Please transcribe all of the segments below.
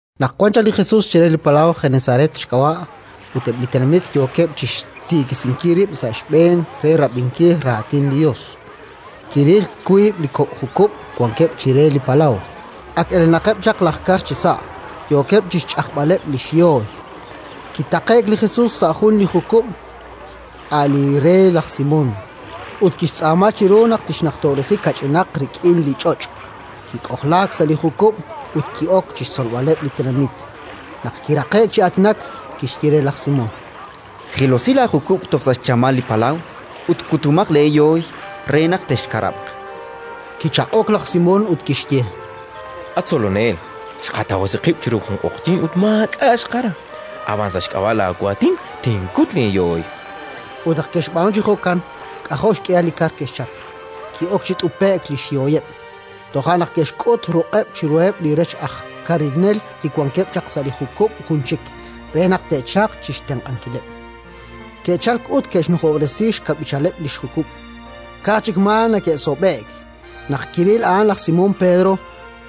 Naq wan chaq li Jesus chire li palaw Genesaret xk'ab'a' ut eb' li tenamit yookeb' chi xtiikisinkil rib' sa' xb'een re rab'inkil Raatin li Yos, kiril wiib' li kok' jukub' wankeb' chire li palaw. Ak elenaqeb' chaq laj kar chisa', yookeb' chi xch'ajb'aleb' li xyooy. Kitaqe'k li Jesus sa' jun li jukub', a' li re laj Simón, ut kixtz'aama chiru naq tixnajtob'resi kach'inaq rik'in li ch'och'; kik'ojlaak sa' li jukub' ut ki'ok chi xtzolb'aleb' li tenamit. Naq kiraqe'k chi aatinak, kixye re laj Simón: —Jilosi laajukub' toj sa' xchamal li palaw ut kutomaq leeyooy re naq texkarab'q. Kichaq'ok laj Simón ut kixye: —At Tzolonel, xqatawasi qib' chiru jun q'oqyink ut maak'a' xqakara. Ab'an, sa' xk'ab'a' laawaatin, tinkut li yooy. Ut naq ke'xb'aanu chi jo'kan, k'ajo' xk'ihal li kar ke'xchap: ki'ok chi t'upe'k li xyooyeb'. Toja' naq ke'xk'ut ruq'eb' chiruheb' li rech aj karinel li wankeb' chaq sa' li jukub' jun chik, re naq te'chalq chi xtenq'ankileb'. Ke'chalk, ut ke'xnujob'resi xkab'ichal li jukub': ka'aj chik maa neke'sob'e'k! Naq kiril a'an laj Simón Pedro,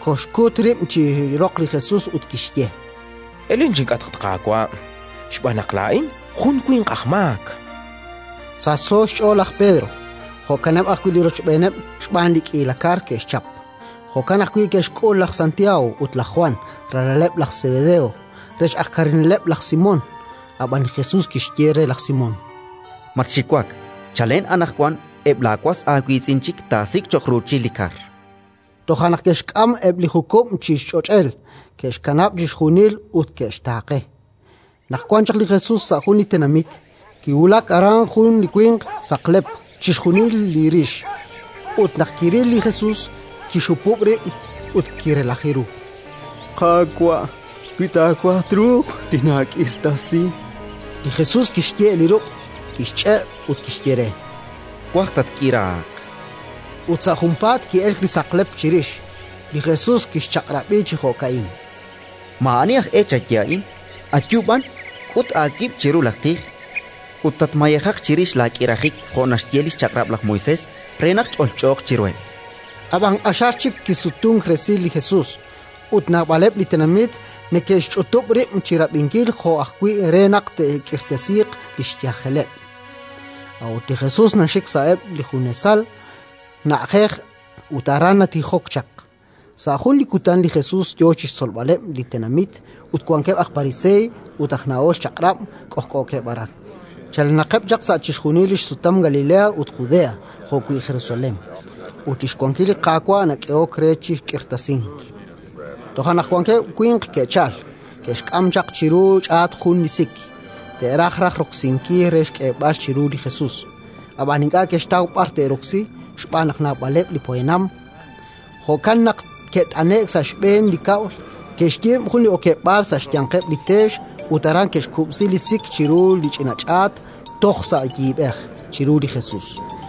koxkut rib' chi roq li Jesus ut kixye: —Elen chink'atq, at Qaawa', xb'aan naq laa'in jun winq aj maak! Sachso xch'ool laj Pedro, jo'kaneb' ajwi' li rochb'een xb'aan li k'iila kar ke'xchap. Jo'kan ajwi' ke'xk'ul laj Santiago ut laj Jwan, ralaleb' laj Sebedeo, rech aj karineleb' laj Simón. Ab'an li Jesus kixye re laj Simón: —Matxiwak. Chalen anaqwan eb' laawas aawiitz'in chik taasik' cho'q ruuchil li kar. Toja' naq ke'xk'am eb' li jukub' chi ch'och'el, ke'xkanab' chixjunil ut ke'xtaaqe. Naq wan chaq li Jesus sa' jun li tenamit, kiwulak aran jun li winq saqlep chixjunil li rix ut, naq kiril li Jesus, kixhupub' rib' ut kirelaji ru: —Qaawa', wi taawaj, truuq tinaak'irtasi, chan re. Li Jesus kixye' li ruq', kixch'e' ut kixye re: —Twaj, tatk'iraaq. Ut sa' junpaat ki'elk li saqlep chirix. Li Jesus kixchaq'rab'i chi jo'ka'in: —Maa'ani aj e chaye a'in; ayu b'an, k'ut aawib' chiru laj tij ut tatmayejaq chirix laak'irajik jo' naxye li xChaq'rab' laj Moisés re naq ch'olch'ooq chiruheb', chan. Ab'anan q'axal chik kisutunk resil li Jesus, ut naab'aleb' li tenamit neke'xch'utub' rib' chi rab'inkil jo' ajwi' re naq te'k'irtasiiq li xyajeleb'. A'ut li Jesus naxik sa'eb' li junesal na'ajej ut aran natijok chaq. Sa' jun li kutan li Jesus yo chi xtzolb'aleb' li tenamit ut wankeb' aj Pariseey ut aj nahol Chaq'rab' k'ojk'ookeb' aran, chalenaqeb' chaq sa' chixjunil li xsutam Galilea ut Judea, jo'wi' Jerusalén. Ut li xwankil li Qaawa' nak'ehok re chi k'irtasink. Toja' naq wankeb' winq ke'chalk, ke'xk'am chaq chiru ch'aat jun li sik: te'raj raj roksinkil re xk'eeb'al chiru li Jesus. Ab'anan ink'a' ke'xtaw b'ar te'roksi xb'aan naq naab'aleb' li poyanam; jo'kan naq ke'taqe'k sa' xb'een li kab'l, ke'xyiib' jun li okeb'aal sa' xyanqeb' li teex ut aran ke'xkub'si li sik chiru li xch'ina ch'aat toj sa' yiib'ej, chiru li Jesus.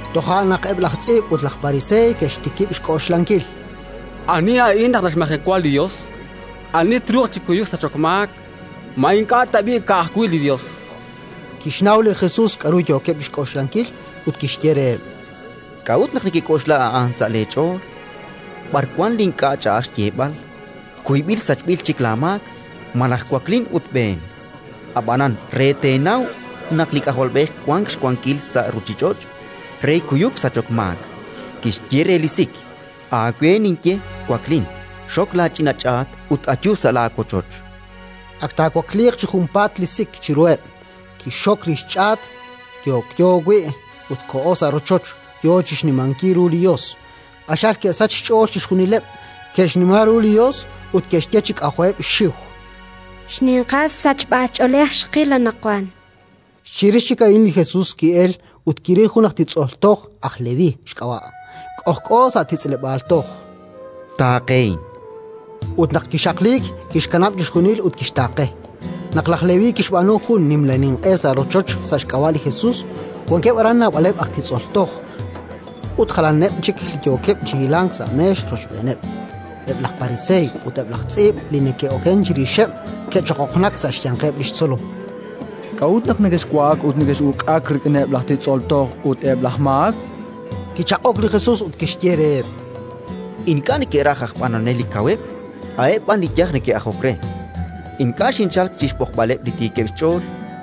Toja' naq eb' laj tz'iib' ut eb' laj pariseey ke'xtikib' xk'oxlankil: “Ani a'in naq naxmajewa li Yos? Ani truuq chi kuyuk sachok maak? Ma ink'a' tab'i' ka'ajwi' li Yos?”, chankeb' sa' xch'ool. Kixnaw li Jesus k'aru yookeb' chi xk'oxlankil ut kixye reheb': —K'a'ut naq nekek'oxla a'an sa' leech'ool? B'ar wank li ink'a' ch'a'aj xyeeb'al: «Kuyb'il sachb'il chik laamaak», malaj: «Waklin ut b'een»? Ab'anan re teenaw naq li K'ajolb'ej wank xwankil sa' ruuchich'och' re kuyuk sachok maak -kixye re li sik: Aawe ninye, waklin, xok laach'ina ch'aat ut ayu sa' laawochoch. Ak taawakliiq chi junpaat li sik chiruheb', kixxok li xch'aat yokyo wi' ut koho sa' rochoch, yo chi xnimankil ru li Yos. Q'axal ke'sachk xch'ool chixjunileb'; ke'xnima ru li Yos ut ke'xye chi k'ajo'eb' xxiw: —Xninqal sachb'ach'oolej xqil anaqwan. Chirix chik a'in li Jesus ki'elk ut kiril jun aj titz'ol toj, aj Leví xk'ab'a', k'ojk'o sa' titz'leb'aal toj: —Taaqehin, chan re. Ut laj Leví kixaqliik, kixkanab' chixjunil ut kixtaaqe. Naq laj Leví kixb'aanu jun nimla ninq'e sa' rochoch sa' xk'ab'a' li Jesus, wankeb' aran naab'aleb' aj titz'ol toj ut jalaneb' chik li yookeb' chi hilank sa' meex rochb'eeneb'. Eb' laj pariseey ut eb' laj tz'iib' li neke'okenk chirixeb' ke'choqoqnak sa' xyanqeb' li xtzolom: —K'a'ut naq nekexwa'ak ut nekex'uk'ak rik'ineb' laj titz'ol toj ut eb' laj maak? chankeb'. Kichaq'ok li Jesus ut kixye reheb': —Ink'a' neke'raj aj b'anonel li kaweb', a'eb' b'an li yaj neke'ajok re. Ink'a' xinchalk chi xb'oqb'aleb' li tiikeb' xch'ool,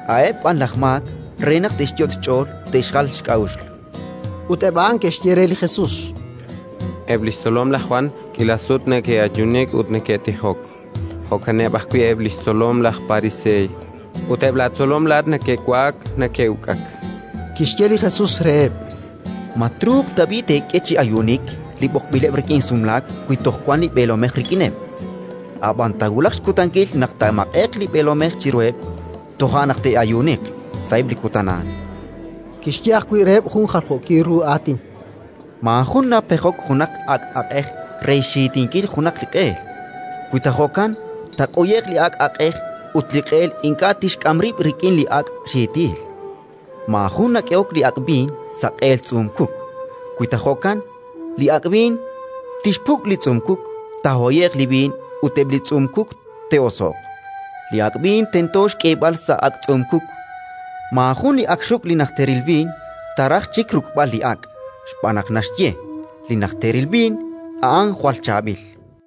a'eb' b'an laj maak re naq te'xyot' xch'ool te'xjal xk'a'uxl. Ut eb' a'an ke'xye re li Jesus: —Eb' li xtzolom laj Jwan k'iila sut neke'ayuunik ut neke'tijok, jo'kaneb' ajwi' eb' li xtzolom laj Pariseey; ut eb' laatzolom laa'at neke'wa'ak neke'uk'ak. Kixye li Jesus reheb': —Ma truuq tab'i' teek'e chi ayuunik li b'oqb'ileb' rik'in sumlaak wi toj wank li b'eelomej rik'ineb'? Ab'an taawulaq xkutankil naq taamaq'e'q li b'eelomej chiruheb': toja' naq te'ayuuniq, sa'eb' li kutan a'an. Kixye ajwi' reheb' jun jaljookil ru aatin: —Maajun napejok junaq ak' aq'ej re xxiitinkil junaq li q'eel. Wi ta jo'kan, taaq'uye'q li ak' aq'ej ut li q'eel ink'a' tixk'am rib' rik'in li ak' xiitil. Maajun nak'ehok li ak' b'iin sa' q'eel tz'uum-kuk. Wi ta jo'kan, li ak' b'iin tixpuk' li tz'uum-kuk, taahoye'q li b'iin ut eb' li tz'uum-kuk te'oso'q. Li ak' b'iin tento xk'eeb'al sa' ak' tz'uum-kuk. Maajun li ak xruk' li najteril b'iin, taaraj chik ruk'b'al li ak', xb'aan naq naxye: «Li najteril b'iin, a'an jwal chaab'il».